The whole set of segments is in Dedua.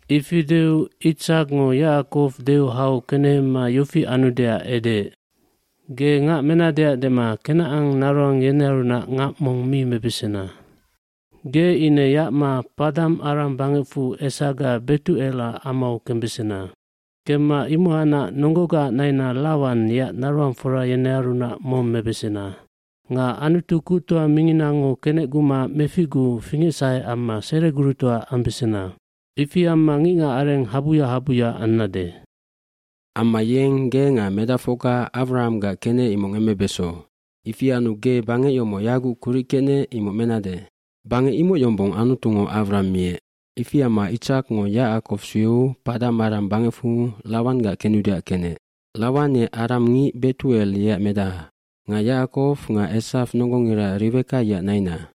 aIfi deu Itsakngo Yacakow deu hau kenehema yofi anudeac edeec, “Ge ngac menadeac dema Kenacan naroang yenearunac ngac mong mi mebesena. bGe ine yacma Paddan Aram bangecfu esaga Betucelac amau kembesena. Kemma imohacnac nonggogaac naina Lawan yeac naroangfora yenearunac mong mebesena. Nga Anutu Kuctoa minginango kenecguma meficguu fingecsahe amma seregurutoa ambesena. Ifi amma ngicngacareng habuya habuya ambesannec. cAmma yeng ge nga medacfocga Awrahamgac kenec imoc ngemmebeso. Ifi anu ge bangec yomoc yaguc kuric kecnec imoc mebesannec. Bangec imoc yombong Anutungo Awraham miec.” dIfi amma Itsakngo Yacakow sueu Paddan Aram bangecfu Lawanggac kenudeac kenec. Lawan ye aramngic Betucel yeac medaha nga Yacakow nga Esaw nonggongira Riweka yeac naina.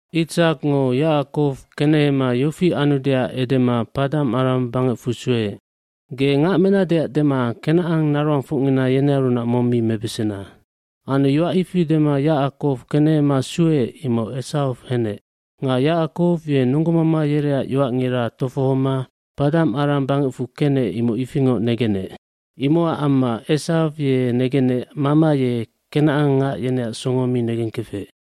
Itsakngo Yacakow kenehema yofi anudeac edema Paddan Aram bangecfu sueec, “Ge ngac menadeac dema kenacannaroangfocngina yenearunac mong mi mebesena.” Anu yoac ifi dema Yacakow kenehema sueec imoc Esaw henec. Nga Yacakow ye nonggomama yereac yoacngira tofohoma Paddan Aram bangecfu kenec imoc ifingoc negenec. Imocac amma Esaw ye negenec mama ye kenacangngac yeneac songo mi negengkefec.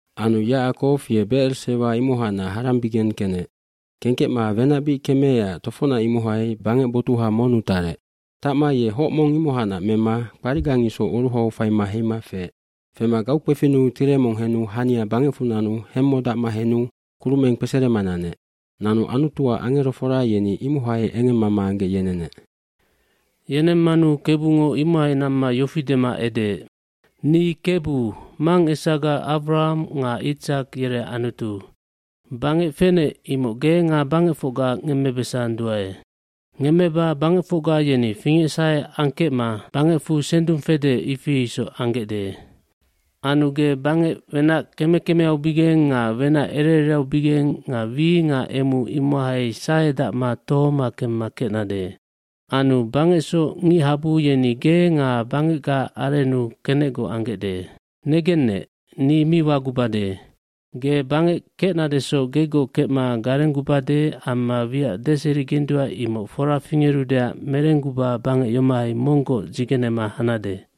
fAnu Yacakow ye Becer Sewa imohacnac Harambigeng kenec. Kengkecma wenac bic kemeecac tofocnac imohai bangec botuha monnu tarec. Tacma ye hoc mong imohacnac mema kparicgang isoc oruhau faima heima feec. gFema gaukpefinnu tire mong henu hania bangecfu nanu hemmodacma henu kurumeng kpeserema nanec. Nanu Anutuac angerofora yeni imohai engemmama anggec yenenec. hYenemmanu Kebungo imohai namma yofi dema edeec, “Ni Kebu, mangesaga Awraham nga Itsak yereac Anutu. Bangec fenec imoc ge nga bangecfocga ngemmebesandua. iNgemmeba bangecfocga yeni fingecsahe angengkecma bangecfu sendung fede ifi isoc ambesandae. Anu ge bangec wenac keme kemeaubigeng nga wenac ere ereaubigeng nga wi nga emu imohai sahedacma tohoma kemma kecnade. Anu bangecsoc ngicngachabu yeni ge nga bangecgaac arennu kenecgoc ambesandae. jNegennec, ni mi wagubade. Ge bangec kecnadesoc gegoc kecma garenggubade amma wiac deserigendua imoc fora fingerudeac merengguba bangec yomohai monggoc dzigenema habesannec.”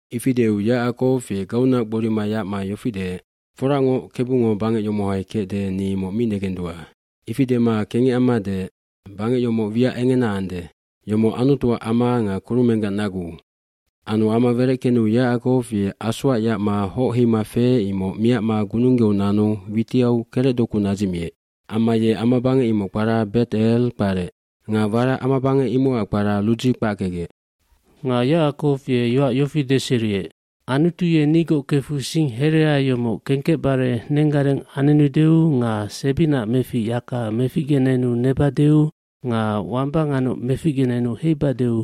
Ifi deu Yacakow ye gaunac gborima yacma yofi deec, “Foracngoc, Kebungo bangec yomohai kecde ni imoc mi negendua.” kIfi dema kengec amma deec, “Bangec yomoc wiac engena ande. Yomoc Anutuac ama nga kurumenggac nagu ande.” Anu ama wereckenu Yacakow ye asoac yacma hoc heima feec imoc miacma gununggeu nanu witiau kerecdoku nadzicmiec. mAmma ye amabangec imocac kpara Bet Ell kparec. Nga warac amabangec imocac kpara Ludzi kpackecgec. Nga Yacakow ye yoac yofi deseriec, “Anutu ye nigoc kefu sing herea yomoc kengkecbare nenggareng anenudeu nga sebinaac mefic yaka meficgenenu nebadeu nga wamba nganoc meficgenenu heibadeu